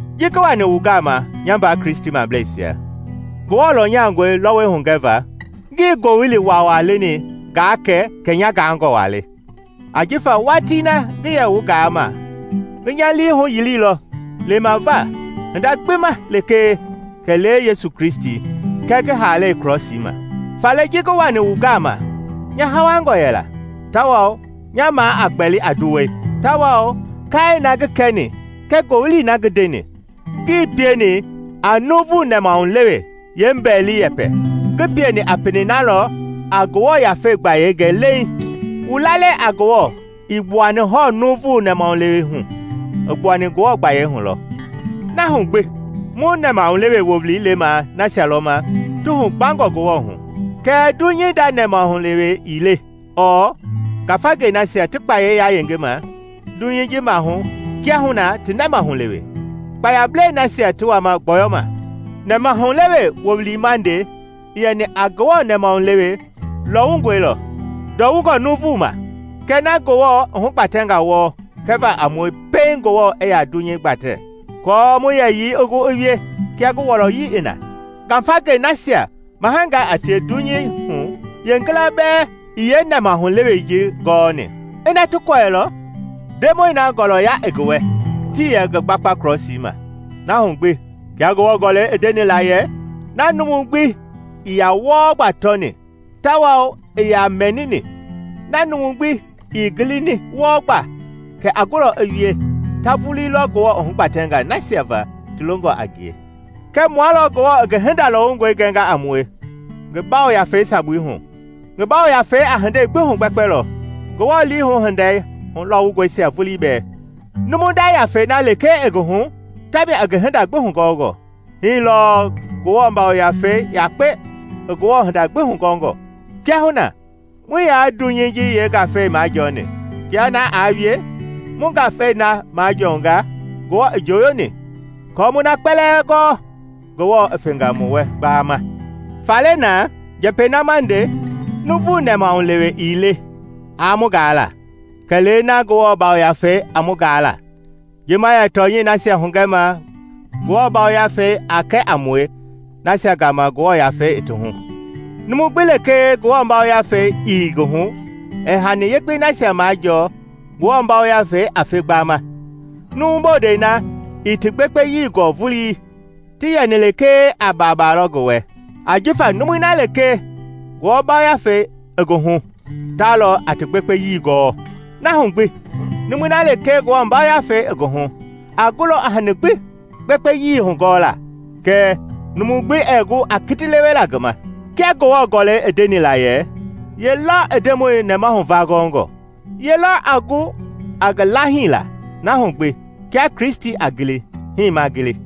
Ji ngi wani wu gama, nya mbaa Kristimableisia, Ngewɔ lɔnya lɔwungɔi hugɛva, ngii ngowili waawaa leni ngaa kɛ kɛ nya gaangɔ waa le. Ajifa watii na ngi yɛ wu gama ngi nya lii huyiliilɔ lemava hinda gbi ma lekee kɛlee Yesu Kristi, kɛɛ ngi haalei krɔsii ma. Faale ji ngi wani wu gama nya hawangɔ yɛla, tawao nya maa a gbɛli a nduwɛi, tawao kaai na ngi kɛni kɛɛ ngowili na ngi ndeni, ngii pieni a nuuvu nɛmahulewe yeembɛili-yɛpɛ, ngi pieni a pelei na lɔ a Ngewɔ Yafei gbayei gɛ leiŋ. Wu lalei a Ngewɔ ii gbuani hɔɔ nuuvu nɛmahulewe hu, i gbuani Ngewɔ gbayei hu lɔ. Na hu gbi, mu nɛmahulewe wowili lema nasia lɔ ma ti hu gbangɔ Ngewɔ hu. Kɛɛ dunyei nda yeenɛmahulewe ii le ɔɔ ngafangei nasia ti kpayei yayengema dunyei ji maahu kiahuna ti nɛmahulewe, kpayablɛi nasia ti wama gbɔyɔma. Nɛmahulewe wowili ma nde i yɛni a Ngewɔ nɛmahulewe lɔwungɔi lɔ, ndɔwungɔ nuuvungaa ma, kɛɛ na Ngewɔ i hugbatɛnga wɔɔ kɛva a mue pɛiŋ Ngewɔ i yaa dunyei gbatɛ aako mu yɛyii i gu i wie kia ngi wɔlɔyi i na. Ngafangei nasia mahangaa a tie dunyei hu yeengila bɛɛ ii yeenɛmahulewei ji gɔɔni. Ina ti kɔɛilɔ, Ndemɔi na ngɔlɔya ngi wɛ, tii yɛ ngi gbakpa krɔsii ma. Na hu gbi, kia Ngewɔ Gɔlɛi i ndeni la yɛ, “Na numu gbi ii yaa wɔɔ gba tɔni tawao ii yaa mɛnini, na numu gbi ii gilini wɔɔ gba kɛ a gulɔ i wie, ta vulii lɔ Ngewɔ i hugbatɛnga nasia va ti longɔ a ngie.” Kɛɛ mua lɔ Ngewɔ i ngi hinda lɔwungɔi gɛnga a mue ngi Yafei sabui hu. Jifa ngi Yafei a hindei gbi hugbɛkpɛlɔ, Ngewɔ liihu hinda lɔɔwungɔisia vulii bɛɛ. Numu nda yafei na lekee i ngi hu tamia i ngi hinda gbi hugɔngɔ; hii lɔɔ Ngewɔ Yafei yakpe i Ngewɔ hinda gbi hugɔngɔ. Kiahuna muii yaa dunyei ji yeengafei majɔɔni; kia na aa wie, mu ngafei na lɔ majɔɔnga Ngewɔ i njoyoni, aako mu na kpɛlɛɛ gɔɔ Ngewɔ i fenga mu wɛ gbaama. Faale naa, njɛpɛi na ma nde, nuuvu nɛmahulewe ii le aa mu gaa la, kɛlee na Ngewɔ Yafei a mu gaa la, ji ma yɛ tɔnyɛi nasia hugɛma Ngewɔ Yafei a kɛ a mue nasia gama Ngewɔ Yafei i ti hu. Numu gbi lekee Ngewɔ Yafei ii ngi hu, ɛɛ hani yekpei nasia majɔɔ Ngewɔ yafei a fe gbaama. Numu bondɛi na ii ti gbekpeyii gɔɔ vulii, ti yɛni lekee a baaba lɔ ngi wɛ, ajifa numui na lekee Ngewɔ Yafei i ngi hu ta lɔ a ti gbekpeyii gɔɔ. Na hu gbi, numui na lekee Ngewɔ Yafei i ngi hu a gulɔ a hani gbi gbekpeyii hugɔɔlaa, kɛɛ numu gbi ɛɛ gu a kiti lewela ngi ma. Kia Ngewɔ Gɔlɛi i ndeni la yɛ, “Ye lɔ i Ndemɔi nɛmahu va gɔngɔ? Ye lɔ a gu a ngi laahila?” Na hu gbi, kia Kristi a gili, hii ma gili.